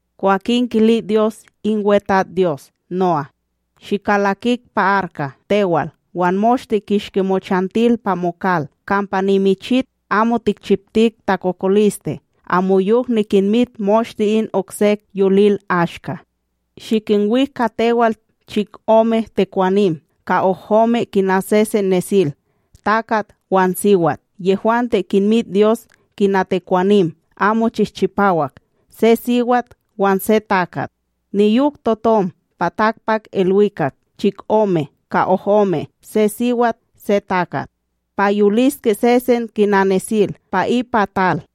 Kwakin kili Dyos in WeTatsDyos No'á: “Shikalakik pa arka tewal wan moshte kishki mochantil pa mokal, kampa nimichit amo tikchiptik takokoliste amoyok nikinmit moshte in oksek yolil ashka. Shikinwik ka tewal chikome tekwanim ka ohome kina sesen nesil; takat wan siwat, yehwante kinmit Dyos kina tekwanim amo chihchipawak, se siwat wan se takat. Niyok totom pa takpakIlwikak chikome ka ohome se siwat se takat, pa yoliske sesen kina nesil pa ipa tal.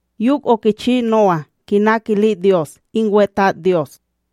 Yok okichi No'á kina kili Dyos in WeTatsDyos.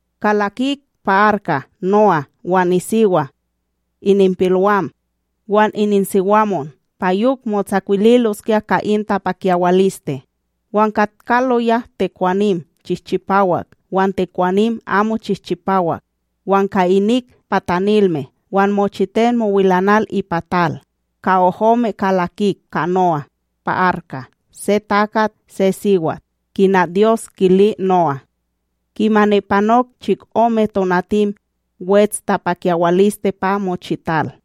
Kalakik pa arka No'á wan nisiwa, ininpilwam wan nisiwamonwam, pa yok motsakwililoskya ka in tapakyawaliste. Wan katkaloya tekwanim chihchipawak wan tekwanim amo chihchipawak, wan ka inik patanilme wan mochiten mowilanal ipa tal, ka ohome kalakik ka No'á pa arka, se takat se siwat, kina Dyos kili No'á. Kimani panok chikome tonatim, wets tapakyawaliste pa mochital.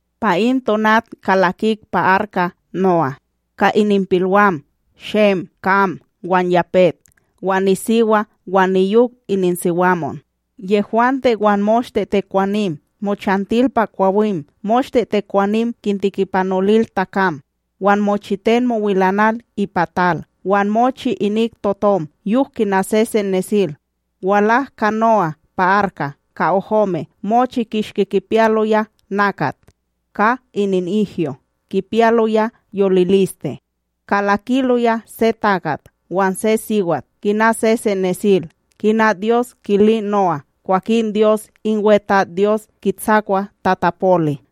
Pa in tonat kalakik pa arka No'á, ka ininpilwam Shem, Kam wan Yapet, wan nisiwa wan niyok ininsiwamonwam. Yehwante wan moshte tekwanim mochantil pa kwawim moshte tekwanim kintikipanolil takam, wan mochiten mowilanal ipa tal, wan mochi inik totom yok kina sesen nesil. Walak ka No'á pa arka ka ohome mochi kishki kipiyaloya nakat ka ininihyo kipiyaloya yoliliste; kalakiloya se takat wan se siwat kina sesen nesil, kina Dyos kili No'á. Kwakin Dyos in WeTatsDyos kitsakwa tatapoli.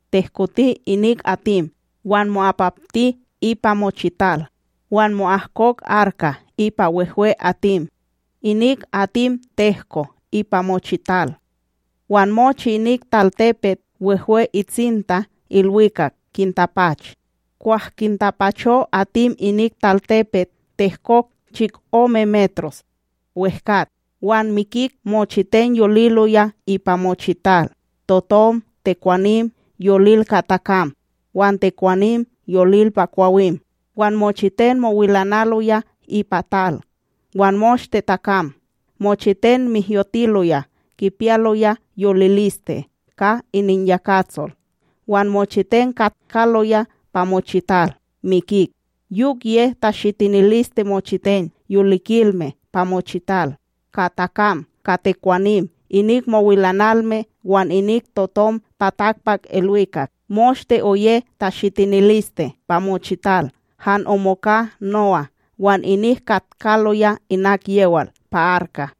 Tehkoti inik atim wan mo'apakti ipa mochital, wan mo'ahkok arka ipa wehwe atim. Inik atim tehko ipa mochital, wan mochi inik talTepet wehwe itsinta ilwikak kintapach. Kwah kintapacho atim inik talTepet tehkok chikome metros wEhkat. Wan mikik mochiten yoliloya ipa mochital: totom, tekwanim yolil ka takam wan tekwanim yolil pa kwawim, wan mochiten mowilanaloya ipa tal, wan moshte takam. Mochiten mihyotiloya kipiyaloya yoliliste ka ininyakatsol wan mochiten katkaloya pa mochital mikik. Yok ye tashitiniliste mochiten yolikilme pa mochital, ka takam ka tekwanim, inik mowilanalme wan inik totom pa takpakIlwikak. Moshte oye tashitiniliste pa mochital. Han omoka No'á wan inik katkaloya inak yewal pa arka.